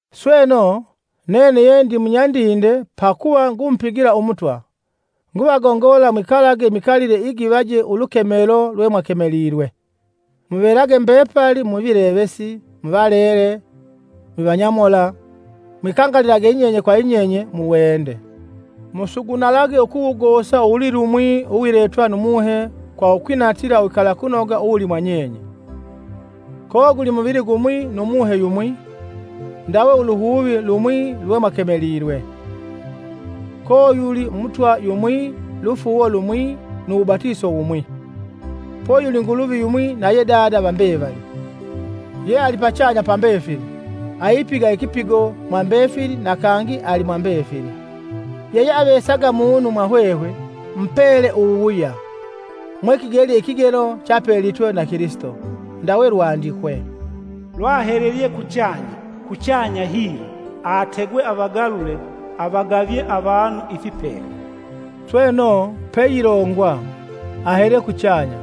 Sweno, nene ye ndimunyandinde pakuva ngumupigila Umutwa, nguvagongola mwikalage imikalile igivaje ulukemelo lwemwakemelilwe. Muvelage mbepali muvilevesi, muvalele, muvanya mola, mwikangalilage yinyenye kwa yinyenye mu wende. Musugunalage ukuwugosa uwulilumwi uwiletwa nu Muhe kwa ukwinatila uwikalakunoga uwuli mwa nyenye. Koguli muvili gumwi nu Muhe yumwi, ndawe uluhuvi lumwi lwemwakemelilwe. Koyuli Mutwa yumwi, lufuuwo lumwi nu wubatiso wumwi; poyuli Nguluvi yumwi na ye Dada va mbevali, ye ali pachanya ye mbefili, ayipiga ikipigo mwa mbefili na kangi ali mwa mbefili. Yeyeavesaga munu mwa hwehwe mupele uwuwuya, mwekigelye ikigelo chapelitwe na Kilisito. Ndawe lwandikwe: “Lweahelelye kuchanya, kuchanya hilo, ategwe avagalule; Avagavye avanu ifipelwa.” Sweno, peyilongwa: “Ahele kuchanya,”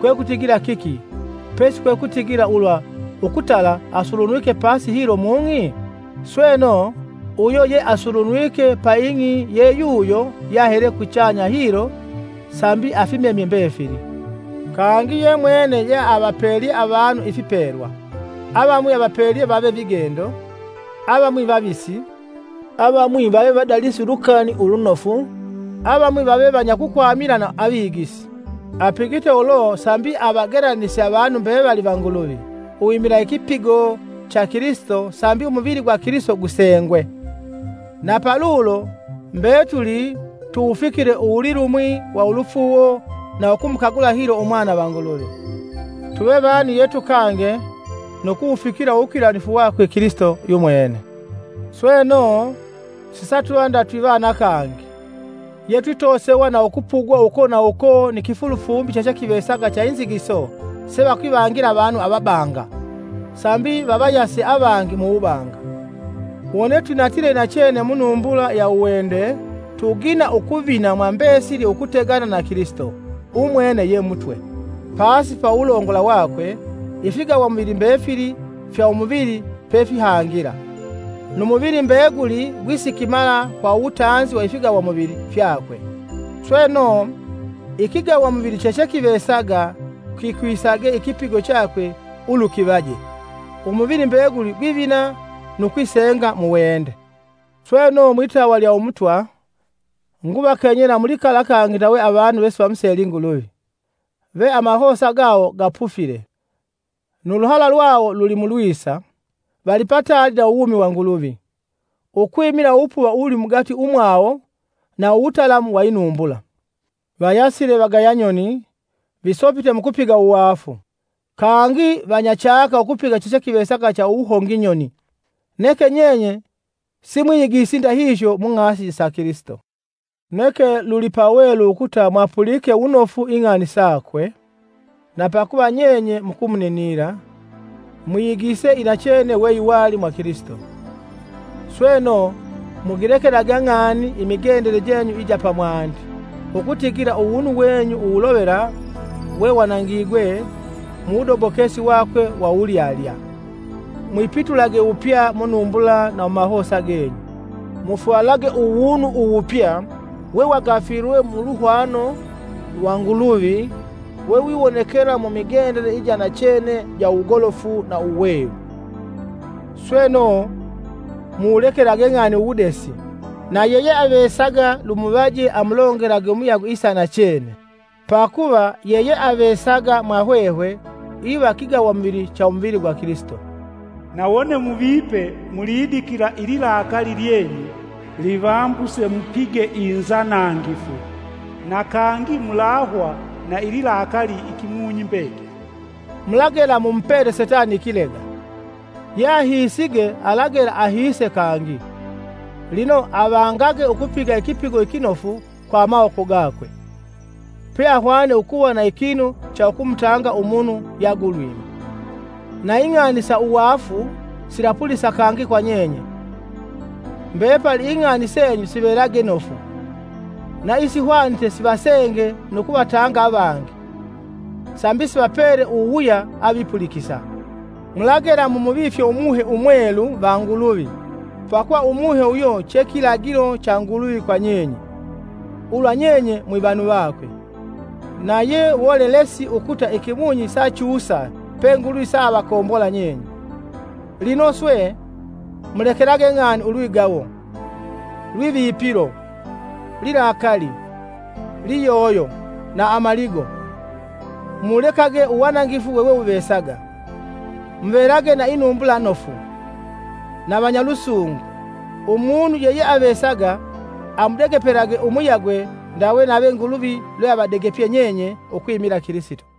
kwekutigila kiki pesi kwekutigila ulwa ukutala asulunwike pasi hilo mung'i? Sweno, uyo yeasulunwike pa ing'i ye yuyo yeahele kuchanya hilo sambi afimemye mbefili. Kangi yemwene yeavapelye avanu ifipelwa: Avamwi avapelye vave vigendo, avamwi vavisi, avamwi vave vadalisi Ulukani Ulunofu, avamwi vave vanyakukwamila na avigisi. Apigite ulo sambi avagelanise avanu mbevali va Nguluvi uwimila ikipigo cha Kilisito sambi umuvili gwa Kilisito gusengwe, na palulo mbetuli tuwufikile uwulilumwi wa ulufuuwo na ukumukagula hilo Umwana va Nguluvi; tuve vanu yetukange nu kuwufikila uwukwilanifu wakwe Kilisito yumwene. Sweno, sisatuva nda twivana kangi, ye twitosewa na ukupugwa uko na uko ni kifulufumbi chechekivesaga cha inzigiso sevakwivangila avanu avabanga, sambi vavayase avangi muwubanga. Wone twinatile inachene munumbula ya uwende tugina ukuvina mwa mbesili ukutegana na Kilisito, umwene ye mutwe; pasi pa uwulongola wakwe, ifigawamuvili mbefili fya umuvili pefihangila, nu muvili mbeguli gwisikimala kwa uwutanzi wa ifigawamuvili fyakwe, sweno, ikigawamuvili chechekivesaga kikwisage ikipigo chakwe ulukivaje, umuvili mbeguli gwivina nu kwisenga mu wende. Sweno, mwitawa lya Umutwa, nguvakenyela mulikala kangi ndawe avanu vesivamuseli Nguluvi, ve amahosa gawo gapufile, nu luhala lwawo luli mulwisa. Vali pataali na uwumi wa Nguluvi, ukwimila uwupuva uwuli mugati umwawo na uwutalamu wa inumbula. Vayasile vagaya nyoni, vitanise muukupiga uwaafu; kangi vanya chaka ukupiga chechekivesaga cha uwuhongi nyoni. Neke nyenye simwiyigisi ndahihyo mung'ani sa Kilisito. Neke lulipawelu ukuta mwapulike wunofu ing'ani sakwe, na pakuva nyenye mukumuninila, mwivigisi inachene weyiwali mwa Kilisito. Sweno, Mugilekelage ng'ani imigendele jenyu ija pamwandi, ukutigila uwunu wenyu uwulovela wewanangigwe mu wudobokesi wakwe wa uwulyalya. Mwipitulage wupya munumbula na mumahosa genyu. Mufwalage uwunu uwupya we wagafilwe muluhwano lwa Nguluvi we wiwonekela mu migendele ija nachene ja uwugolofu na uwelu. Sweno, muwulekelage ng'ani uwudesi. Na yeyeavesaga lumuvaje amulongelage umuyagwe isa nachene, pakuva yeyeavesaga mwahwehwe iva kigawamuvili cha umuvili gwa Kilisito. Na wone muvipe, mulidikila ililakali lyenyu livambuse mupige inzanangifu, na kangi mulahwa na ililakali ikimunyi mbekili. Mulagela mumupele Setani ikilega. Yahiisige alagela ahiise kangi, lino avangage ukupiga ikipigo ikinofu kwa amawoko gakwe, peahwane ukuva na ikinu cha ukumutanga umunu yagulwime, na ing'ani sa uwaafu silapulisa kangi kwa nyenye; mbepali ing'ani senyu sivelage nofu na isihwanite sivasenge nu kuvatanga avangi, sambi sivapele uwuwuya avipulikisa. Mulagela mumuvifye Umuhe Umwelu va Nguluvi pakuva Umuhe uyo chekilagilo cha Nguluvi kwa nyenye, ulwa nyenye mwivanu vakwe, na ye wolelesi ukuta ikimunyi sachusa pe Nguluvi saavakombola nyenye. Lino swe mululekelage ng'ani ulwigawo, lwivipilo, lilakali, liyoyo, na amaligo! Muwulekage uwanangifu wewewuvesaga! Muvelage na inumbula nofu, na vanyalusungu; umunu yeyeavesaga amudegepelage umuyagwe ndawe nave Nguluvi lwe avadegepye nyenye ukwimila Kilisito.